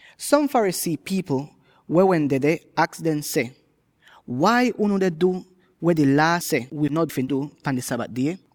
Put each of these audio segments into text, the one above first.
Som Pharisee pipl weh wehn dedeh aks dem seh, “Wai unu deh du weh di Laa seh wi no fi du pan di Sabat die?”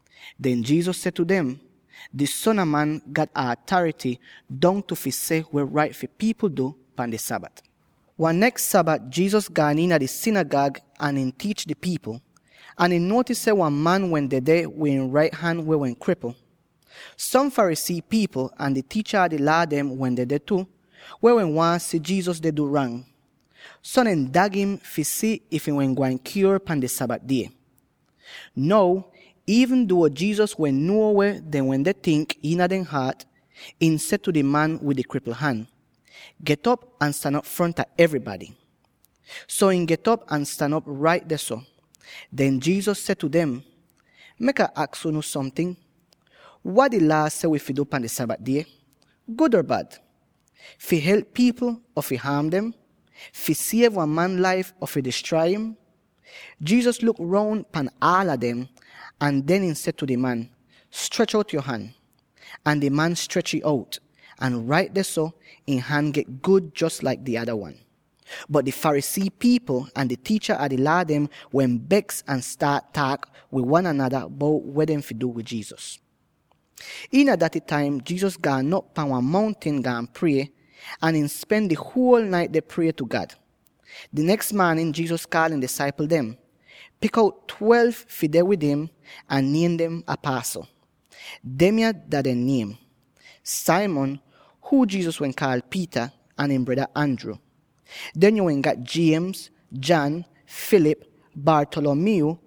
Den Jesus seh tu dem, “Di Son a Man, gat atarity dongtu fi seh weh rait fi pipl du pan di Sabat.” Wan neks Sabat Jesus gaan iina di sinigag ahn tiich di pipl, ahn ihn nuotis seh wan man wehn dedeh wid ihn rait han weh wehn kripl. Som Pharisee pipl ahn di tiicha a di Laa dem wehn dedeh tu, weh wehn waahn si Jesus deh du rang. So dehn dag im fi si if ihn wehn gwain kyuor pan di Sabat die. Now, iivn duo Jesus wehn nuo weh dehn wende tink iina dehn haat, ihn seh tu di man wid di kripl han, “Get'op ahn stan op fronta evrybady.” So ihn get'op ahn stan op rait dehso. Den Jesus seh tu dem, “Mek Ah aks unu somting: Wat wi Laa seh wi fi du pan di Sabat die? Gud or bad? Fi help pipl or fi haam dem? Fi siev wan man laif or fi distrai'im?” Jesus luk roun pan aala dem, ahn den ihn seh tu di man, “Strech out yo han!” Ahn di man strech'ih out, ahn rait dehso ihn han get gud jos laik di ada wan! Bot di Pharisee pipl ahn di tiicha a di Laa dem wehn beks ahn staat taak wid wan anada bout weh dehn fi du wid Jesus. Iina daty taim Jesus gaan op pan wan mountin, gaan prie, ahn ihn spen di huol nait deh prie tu God. Di neks maanin, Jesus kaal ihn disaipl dem, pik out twelve fi deh wid im, ahn niem dem apasl. Demya dah dehn niem: Simon —huu Jesus wehn kaal Peter— ahn ihn breda Andrew. Den yo wehn gat: James, John, Philip, Bartholomew,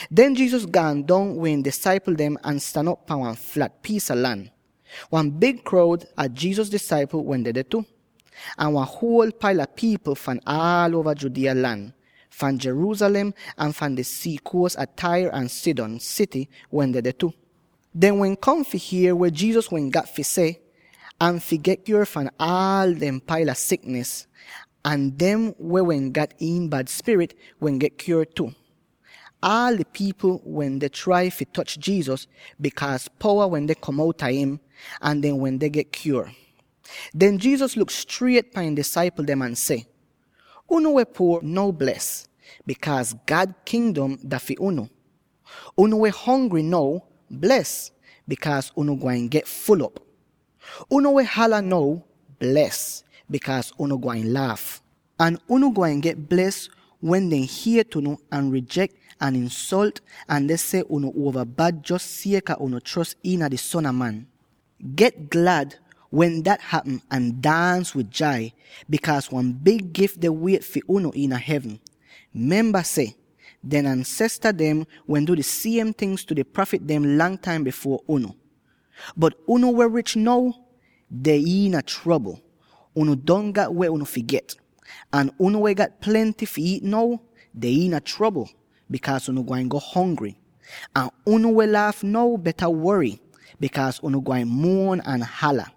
Den Jesus gaan dong wid ihn disaipl dem ahn stan op pan wan flat piis a lan. Wan big kroud a Jesus disaipl wehn dedeh tu, ahn wan huol paila pipl fahn aal uova Judea lan —fahn Jerusalem, ahn fahn di sii kuos a Tyre ahn Sidon sity wehn dedeh tu. Dehn wehn kom fi hier weh Jesus wehn gat fi seh, ahn fi get kyuor fahn aal dehn paila siknis. Ahn dem, weh wehn gat iin bad spirit, wehn get kyuor tu. Aal di pipl wende trai fi toch Jesus, bikaaz powa wende kom outa im, ahn dehn wende get kyuor. Den Jesus luk striet pan ihn disaipl dem ahn seh: “Unu weh puor now, bles; bikaaz God Kingdom dah fi unu! Unu weh hongry now, bles; bikaaz unu gwain get ful'op. Unu weh hala now, bles; bikaaz unu gwain laaf. “Ahn unu gwain get bles wen dehn hiet unu, ahn rijek unu, ahn insolt unu, ahn dehn seh unu uova bad jos sieka unu chros iina di Son a Man. Get glad wen dat hapm ahn daans wid jai, bikaaz wan big gif deh wiet fi unu iina hevn. Memba seh: dehn ansesta dem wehn du di siem ting tu di prafit dem lang taim bifuor unu. Bot unu weh rich now, deh iina trobl; unu don gat weh unu fi get. Ahn unu weh gat plenty fi iit now, deh iina trobl; bikaaz unu gwain go hongry. Ahn unu weh laaf now, beta wory; bikaaz unu gwain muon ahn hala.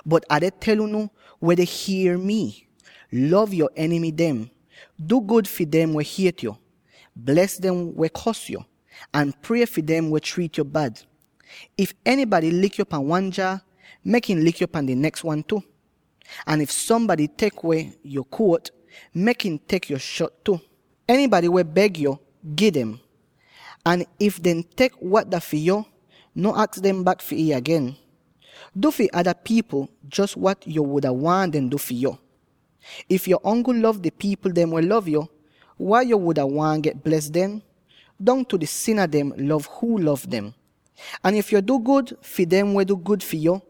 “Bot Ah deh tel unu weh deh hier mii: Lov yo enimy dem! Du gud fi dem weh hiet yo. Bles dem weh kors yo; ahn prie fi dem weh triit yo bad. If enybady lik yo pan wan jaa, mek ihn lik yo pan di neks wan tu. Ahn if sombady tek weh yo jakit, mek ihn tek yo shot tu. Enybady weh beg yo, gi dem. Ahn if dehn tek wat dah fi yo, no aks dem bak fi it agen. Du fi ada pipl, jos wat yo wuda waahn dehn du fi yu. “If yo ongl lov di pipl dem weh lov yo, wai yo wuda waahn get bles den? Dongtu di sina dem lov huu lov dem. Ahn if yo du gud fi dem weh du gud fi yo,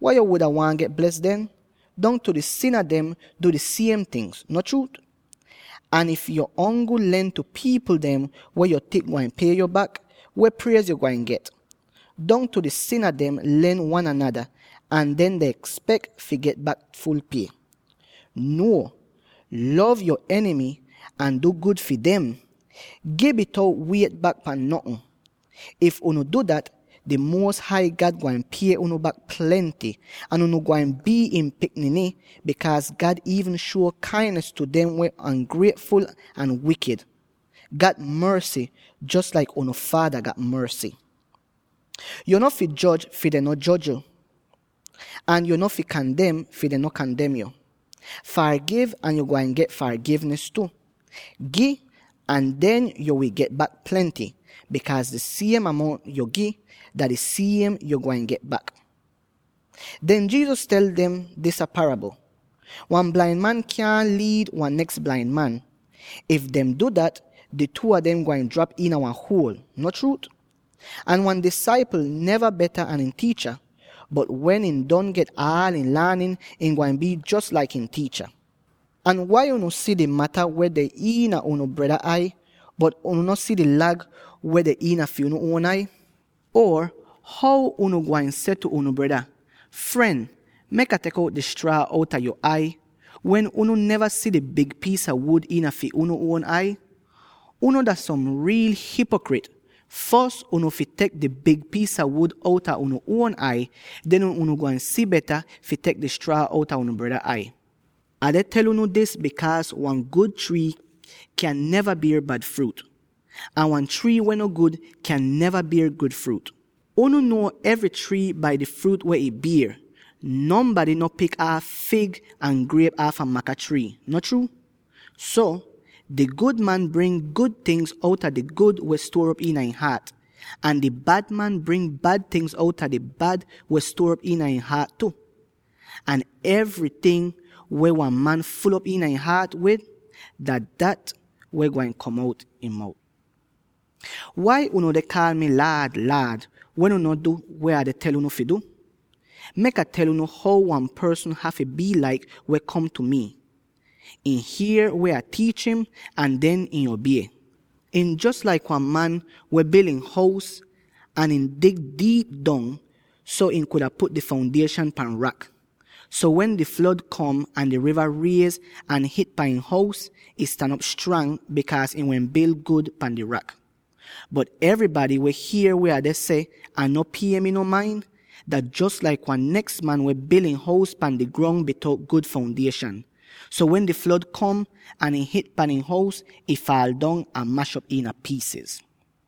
wai yo wuda waahn get bles den? Dongtu di sina dem du di siem ting, no chruut? Ahn if yo ongl len tu di pipl dem weh yo tink gwain pie yo bak, weh priez yo gwain get? Dongtu di sina dem len wan anada, ahn den dehn espek fi get bak ful pie. Nuo, lov yo enimy ahn du gud fi dem! Gi bitout wiet bak pan notn. If unu du dat, Di Muos Hai God gwain pie unu bak plenty, ahn unu gwain bii ihn pikniny, bikaaz God iivn shuo kainis tu dem weh on'grietful ahn wikid. Gat morsy, jos laik unu Faada gat morsy!” “Yo no fi joj, fi dehn no joj yu! Ahn yo no fi kandem, fi dehn no kandem yu! Fargiv, ahn yo gwain get fargivnis tu. Gi, ahn den yo wi get bak plenty. Bikaaz di siem amount yo gi, dah di siem weh yo gwain get bak.” Den Jesus tel dem disa parabl: “Wan blain man kyaahn liid wan neks blain man. If dehn du dat, di two a dem gwain drap iina wan huol, no chruut? Ahn wan disaipl neva beta an ihn tiicha, bot wen ihn don get aal ihn laanin, ihn gwain bii jos laik ihn tiicha. “Ahn wai unu si di mata weh deh iina unu breda ai, bot unu no si di lag weh deh iina fi unu uon ai? Or, how unu gwain seh tu unu breda, ‘Fren, mek Ah tek di straa outa yo ai,’ wen unu neva si di big piis a wuud iina fi unu uon ai? Unu dah som riil hipokrit! Fos unu fi tek di big piis a wuud outa unu uon ai; den unu gwain si beta fi tek di straa outa unu breda ai. “Ah deh tel unu dis bikaaz wan gud trii kyaahn bier bad fruut, ahn wan trii weh no gud kyaahn bier gud fruut. Unu nuo evry trii bai di fruut weh ih bier; nonbady no pik aaf fig ahn griep aafa maka trii, no chruut? So, di gud man bring gud tingz outa di gud weh stuor op iina ihn haat, ahn di bad man bring bad tingz outa di bad weh stuor op iina ihn haat tu. Ahn enyting weh wan man ful'op ihn haat wid, dat dah weh gwain kom outa ihn mout! “Wai unu deh kaal mi, ‘Laad, Laad,’ wen unu no deh du weh Ah tel unu fi du? Mek Ah tel unu how wan porsn hafy bii laik, weh kom tu mi: ihn hier weh Ah tiich im, ahn den ihn obie. Ihn jos laik wan man weh bil ihn hous, ahn ihn wehn dig diip dong, so ihn kuda put di foundieshan pan rak. So, wen di flod kom ahn di riva riez ahn hit pan ihn hous, ih stan op strang, bikaaz ih wehn bil gud pan di rak. Bot enybady, weh hier weh Ah deh seh ahn no pie mi non main, dah jos laik wan neks man weh bil ihn hous pan di grong bitout gud foundieshan. So wen di flod kom ahn ih hit pan ihn hous, ih faal dong ahn mash'op iina piisiz!”